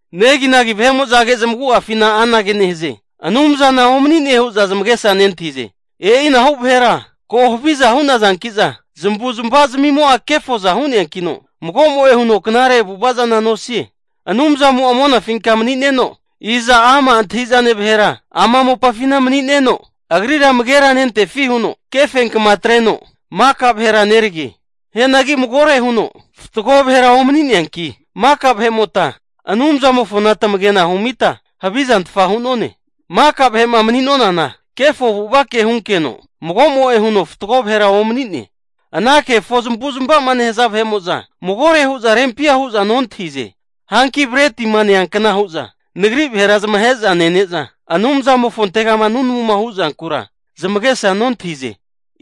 Neginagi vahe'mo'zage zamagu'afina anagea nehaze, Anumzana omani'ne hu'za zamagesa nentahize. E'inahu vahera ko haviza hu'nazanki'za zamavuzmava zmimo'a kefoza hu'neankino, magomo'e huno knare avu'ava zana nosie. Anumzamo'a monafinka mani'neno, iza ama' antahi'zane vahera ama mopafina mani'neno, agrira amagera nentefi huno, kefenkma atreno maka vahera nerage. Hianagi magore huno fatgo vahera omani'neanki maka vahe'mota Anumzamofona tamagena humita havizantfa hu'none. Maka vahe'ma mani'nonana kefo avu'avake hunkeno mago'mo'e huno fatgo vahera omani'ne. Ana kefo zamavu'zmavama nehaza vahe'mo'za magore hu'za rempia hu'za nontahize. Hanki bretima neankna hu'za nagri vahera zamahe'za nene'za Anumzamofontegama nunamuma hu'zankura zamagesa nontahize.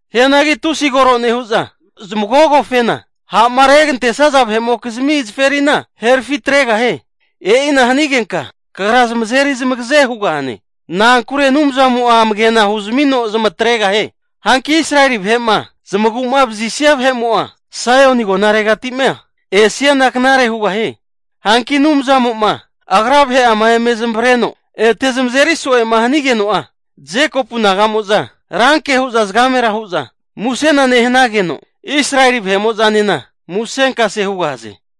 Hianagi tusi koro nehu'za zamagogofena, ha'ma regantesaza vahe'mokizmi zaferina herafi atregahie. E'ina hanigenka kagra zamazeri zamagaze hugahane. Na'ankure Anumzamo'a amagena huzmino zamatregahie. Hanki Israeli vahe'ma zamagu'ma vazisia ne'mo'a Saioni agonaregati'ma esiana knare hugahie. Hanki Anumzamo'ma Agra vahe'ama eme zamavareno ete zamazeri so'ema hanigeno'a, Jekopu naga'mo'za ranke hu'za zagamera hu'za musena nehanageno, Israeli vahe'mo'zanena musenkase hugahaze.